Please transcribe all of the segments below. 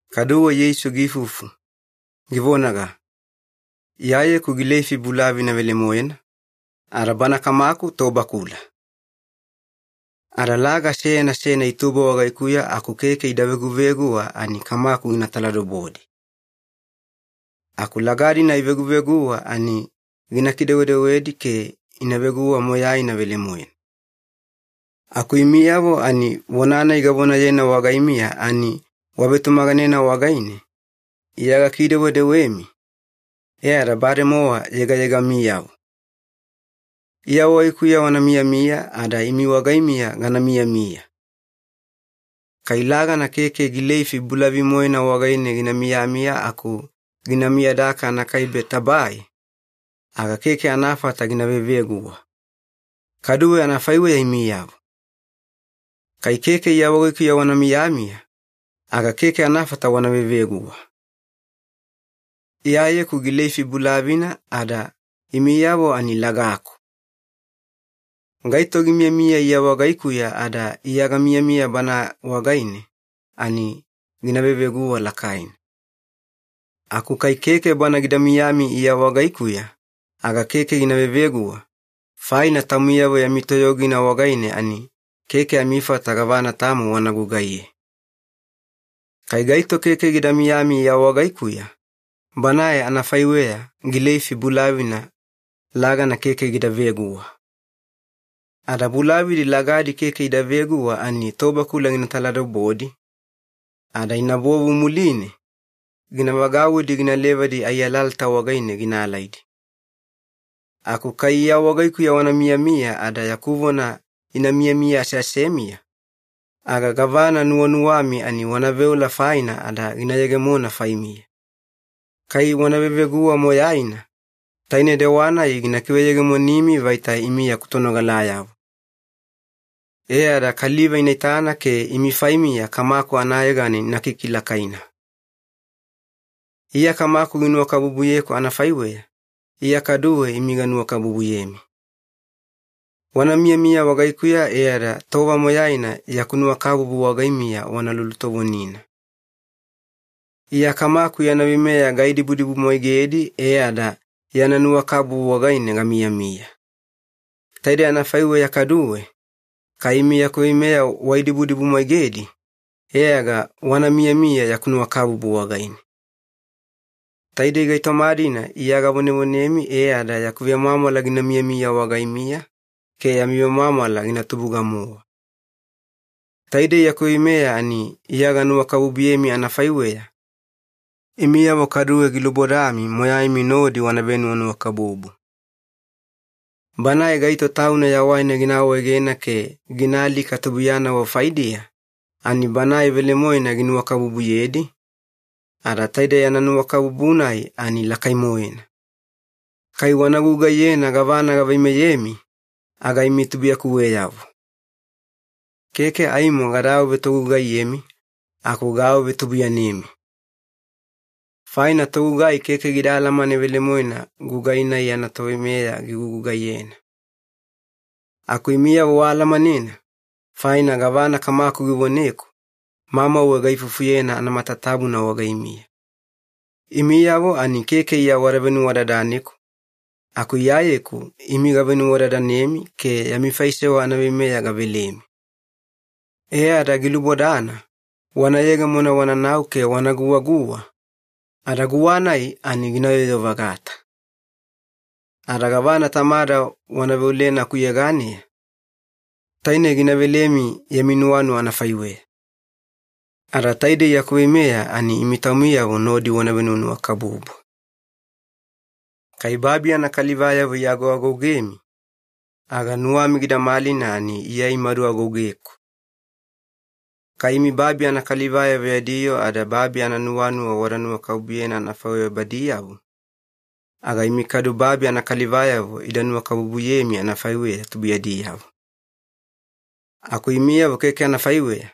Kaduwe Yeisu giifufu, givonaga, “Iyayeku gileifi bulavina velemoena, ada Bana Kamaku tobakula. Ada laga seyana seyana itubo wagaikuya aku keke ida veguveguwa ani Kamaku gina taladobodi. Aku laga-dina iveguveguwa ani gina kidewedewedi ke ina veguwa moyaina velemoena. Aku imiyavo ani vona-nai gavonayena wagaimiya ani wavetumaganena wagaine Iya gakidewedewemi, e ada bademowa yegayegamiyavo. Iya wagaikuya wana miyamiya ada imi wagaimiya gana miyamiya. Kai lagana keke gileifi bulavi-moena wagaine gina miyamiya aku gina miyadaka anakaibe tabae, aga keke anafata gina veveguwa. Kaduwe anafaiweya imiyavo. Kai keke Iya wagaikuya wana miyamiya, aga keke anafata wana veveguwa. “Iyayeku gileifi bulavina ada imiyavo ani lagaku. Gaito gimiyamiya Iya wagaikuya ada Iya gamiyamiya bana wagaine ani gina veveguwa lakaina. Aku kai keke bana gida miyami Iya wagaikuya, aga keke gina veveguwa, faina taumiyavo yami toyogina wagaine ani keke amifata gavana tamo wana gugaiye. Kai gaito keke gida miyami Iya wagaikuya, banae anafaiweya gileifi bulavina lagana keke gida veguwa. Ada bulavidi lagadi keke ida veguwa ani tobakula gina taladobodi, ada inabovu muline, gina vagauwidi gina levadi ai alalata wagaine gina alaidi. Aku kai Iya wagaikuya wana miyamiya ada yaku vona ina miyamiya aseasemiya, aga gavana nuwanuwami ani wana veola faina ada gina yegemona faimiya. Kai wana veveguwa moyaina, taine dewa-nai gina kiveyegemonimi vaita imi yaku tonogalayavo. E ada kaliva ina itana ke imi faimiya Kamaku anayegana ina kikilakaina. “Iya Kamaku ginuwakabubuyeku anafaiweya, Iya kaduwe imi ganuwakabubuyemi. Wana miyamiya wagaikuya e ada tova moyaina yaku nuwakabubu wagaimiya wana lulutovonina. Iya Kamaku yana veimeya gaidibudibumwaigedi e ada yana nuwakabubu wagaine gamiyamiya. Taidei anafaiweya kaduwe, kai imi yaku veimeya waidibudibumwaigedi, e aga wana miyamiya yaku nuwakabubu wagaine. Taidei gaitoma-dina Iya gavonevonemi e ada yaku vemwamwala gina miyamiya wagaimiya ke yami vemwamwala gina tubuga-mowa. Taidei yaku veimeya ani Iya ganuwakabubuyemi anafaiweya, imiyavo kaduwe gilubodami moyaimi nodi wana venuwanuwakabubu. Banae gaito tauna yawaina gina awaegena ke gina alika tubuiyanavo faidiya, ani banae velemoena ginuwakabubuyedi, ada taide yana nuwakabubu-nai ani lakai-moena. Kai wana gugaiyena gavana gaveimeyemi, aga imi tubuiyakuweyavo. Keke aimo gada awavetogugaiyemi, aku gaawavetubuiyanemi. Faina togugai keke gida alamane velemoena gugai-nai yana toveimeya gigugugaiyena. Aku imiyavo waalamanena, faina gavana Kamaku givoneku, mamauwe gaifufuyena anamatatabuna wagaimiya. Imiyavo ani keke Iya wada venuwadadaneku, aku Iyayeku imi gavenuwadadanemi ke yami faisewa anaveimeya gavelemi. E ada gilubodana wana yegemona wananau ke wana guwaguwa, ada guwa-nai ani gina yoyo-vagata. Ada gavana Tamada wana veolena akuyeganeya, taine gina velemi yami nuwanuwa anafaiweya. Ada taidei yaku veimeya ani imi taumiyavo nodi wana venuwanuwakabubu. “Kai babi anakalivayavo iagoagougemi, aga nuwami gida malina ani Iya imadu agougeku. Kai imi babi anakalivayavo yadi yoo ada babi ananuwanuwa wada nuwakabubuyena anafaiweya badiyavo, aga imi kadu babi anakalivayavo ida nuwakabubuyemi anafaiweya tubuiyadiyavo. Aku imiyavo keke anafaiweya,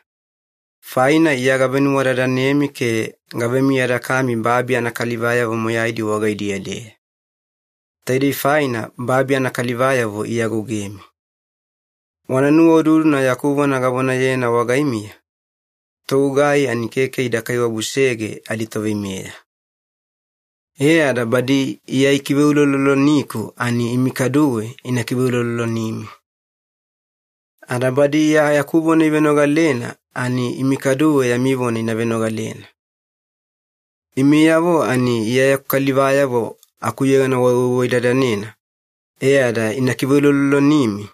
faina Iya gavenuwadadanemi ke gavemiyadakami babi anakalivayavo moyaidi wagaidiya-deya. Taidei faina babi anakalivayavo iagougemi. Wana nuwaududuna yaku vona gavonayena wagaimiya, ‘Togugai ani keke ida kaiwabusege aditoveimeya.’ E ada badi Iya ikiveuloloniku ani imi kaduwe ina kiveulolonimi. Ada badi Iya yaku vona ivenogalena ani imi kaduwe yami vona ina venogalena. Imiyavo ani Iya yaku kalivayavo akuyegana wawaiwaidadanena e ada ina kikiveulolonimi,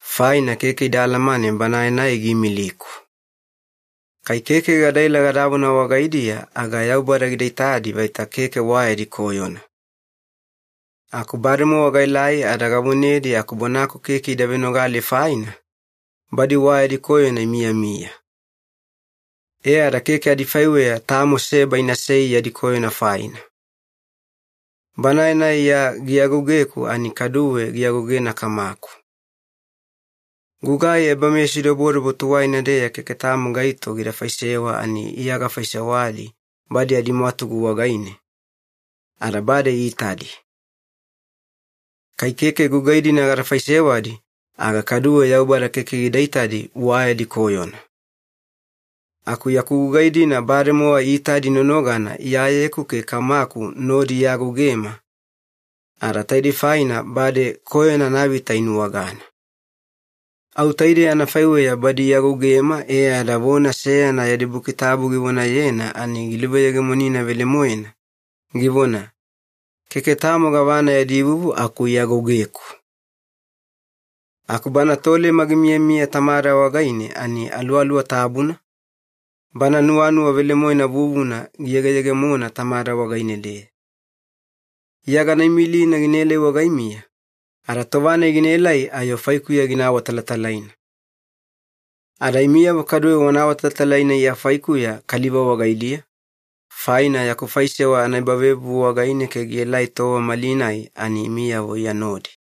faina keke ida alamane Banae-nai giimiliku. Kai keke gadaela gadavona wagaidiya aga Yaubada gida itadi vaita keke wa yadi koyona. Aku bademowa gaelai ada gavonedi aku bonaku keke ida venogale faina, badi wa yadi koyona imiyamiya. E ada keke adifaiweya tamo seba inasei yadi koyona faina. Banae-nai Iya giagougeku ani kaduwe giagougena Kamaku. Gugai ebameyasidobodobo tuwaina-deya keke tamo gaito gida faisewa ani Iya gafaisewadi badi adimwatugu wagaine, ada bade iitadi. Kai keke gugai-dina gada faisewadi aga kaduwe Yaubada keke gina itadi wa yadi koyona. Aku yaku gugai-dina bademowa iitadi nonogana Iyayeku ke Kamaku nodi iagougema, ada taidei faina bade koyona anavita inuwagana. Au taidei anafaiweya badi iagougema e ada vona seyana yadi Buki Tabu givonayena ani giluveyegemonina velemoena, givona, ‘Keke tamo gavana yadi vuvu aku iagougeku.’ “Aku Bana Tolema gimiyamiya Tamada wagaine ani Aluwaluwa Tabuna, Bana nuwanuwa velemoena vuvuna giyegeyegemona Tamada wagaine-deya. Iya gana imilina ginaelai wagaimiya, ada tova-nai ginaelai ayo faikuya gina awatalatalaina. Ada imiyavo kaduwe wana awatalatalaina Iya faikuya kaliva wagaidiya, faina yaku faisewa anaebavevuvu wagaine ke gielai tova malinai ani imiyavo Iya nodi.